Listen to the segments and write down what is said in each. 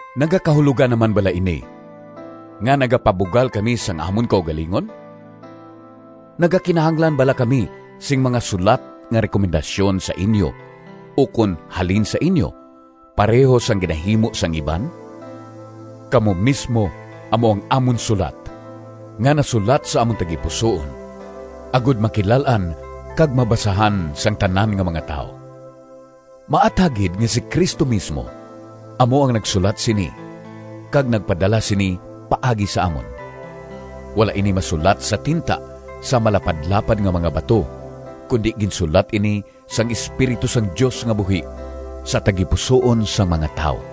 Nagakahulogan na man bala ini nga nagapabugal kami sang amon kaugalingon? Nagakinahanglan bala kami sing mga sulat nga rekomendasyon sa inyo ukon halin sa inyo pareho sang ginahimo sang iban? Kamo mismo amo ang amon sulat, nga nasulat sa amon tagipusoon, agod makilal-an kag mabasahan sang tanan nga mga tawo. Maathag gid nga si Cristo mismo amo ang nagsulat sini kag nagpadala sini paagi sa amon. Wala ini masulat sa tinta sa malapadlapad nga mga bato, kundi ginsulat ini sang Espiritu sang Dios nga buhi, sa tagipusoon sang mga tawo.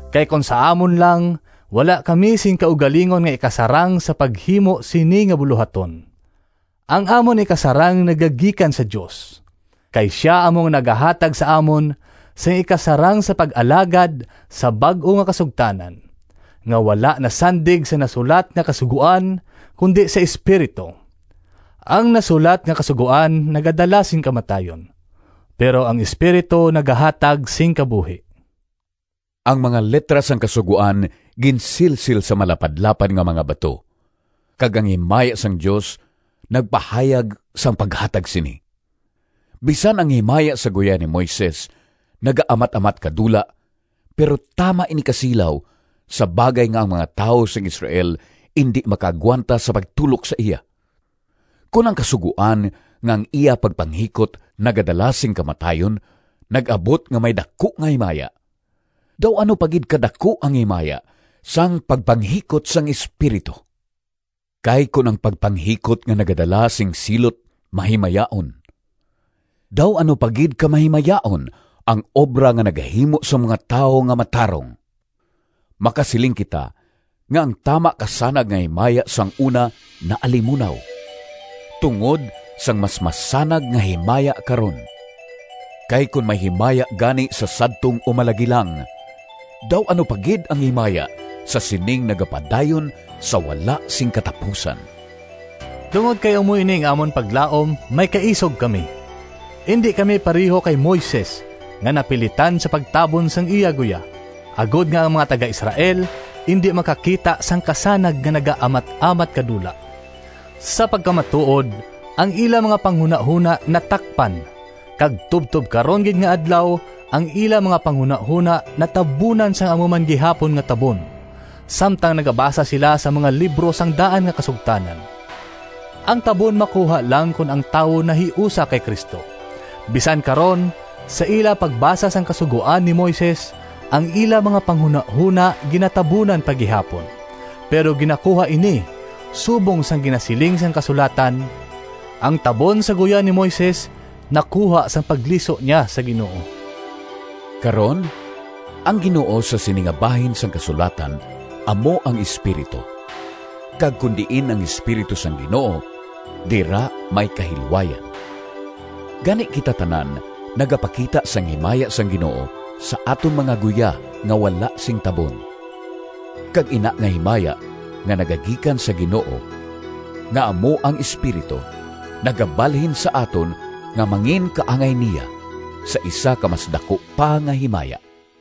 Kay kon sa amon lang wala kami sing kaugalingon nga ikasarang sa paghimo sini nga bulohaton. Ang amon ikasarang nagagikan sa Dios, kay sia amo ang nagahatag sa amon sing ikasarang sa pag-alagad sa bag-o nga kasugtanan, nga wala nasandig sa nasulat nga kasugoan, kundi sa Espiritu. Ang nasulat nga kasugoan nagadala sing kamatayon, pero ang Espiritu nagahatag sing kabuhi. Ang mga litra sang Kasugoan ginsilsil sa malapad-lapad nga mga bato, kag ang himaya sang Dios nagpahayag sang paghatag sini. Bisan ang himaya sa guya ni Moises nagaamat-amat kadula, pero tama ini kasilaw, sa bagay nga ang mga tawo sang Israel indi makaagwanta sa pagtulok sa iya. Kon ang Kasugoan nga ang iya pagpanghikot nagadala sing kamatayon nag-abot nga may daku nga himaya, daw ano pa gid kadaku ang himaya sang pagpanghikot sang Espiritu! Kay kon ang pagpanghikot nga nagadala sing silot mahimayaon, daw ano pa gid ka mahimayaon ang obra nga nagahimo sang mga tawo nga matarong! Makasiling kita nga ang tama kasanag nga himaya sang una naalimunaw, tungod sang mas masanag nga himaya karon. Kay kon may himaya gani sa sadtong umalagi lang, daw ano pa gid ang himaya sa sining nagapadayon sa wala sing katapusan! Tungod kay amo ini ang amon paglaom, may kaisog kami. Indi kami pareho kay Moises, nga napilitan sa pagtabon sang iya guya, agod nga ang mga taga-Israel indi makakita sang kasanag nga nagaamat-amat kadula. Sa pagkamatuod, ang ila mga panghunahona natakpan, kag tubtob karon gid nga adlaw ang ila mga panghunahona natabunan sang amo man gihapon nga tabon, samtang nagabasa sila sang mga libro sang daan nga kasugtanan. Ang tabon makuha lang kon ang tawo nahiusa kay Cristo. Bisan karon, sa ila pagbasa sang Kasugoan ni Moises, ang ila mga panghunahona ginatabunan pa gihapon. Pero ginakuha ini, subong sang ginasiling sang kasulatan, “Ang tabon sa guya ni Moises nakuha sang pagliso niya sa Ginoo.” Karon, “ang Ginoo” sa sini nga bahin sang kasulatan amo ang Espiritu, kag kon diin ang Espiritu sang Ginoo, dira may kahilwayan. Gani, kita tanan nagapakita sang himaya sang Ginoo sa aton mga guya nga wala sing tabon, kag ina nga himaya nga nagagikan sa Ginoo nga amo ang Espiritu, nagabalhin sa aton nga manginkaangay niya, sa isa ka mas daku pa nga himaya.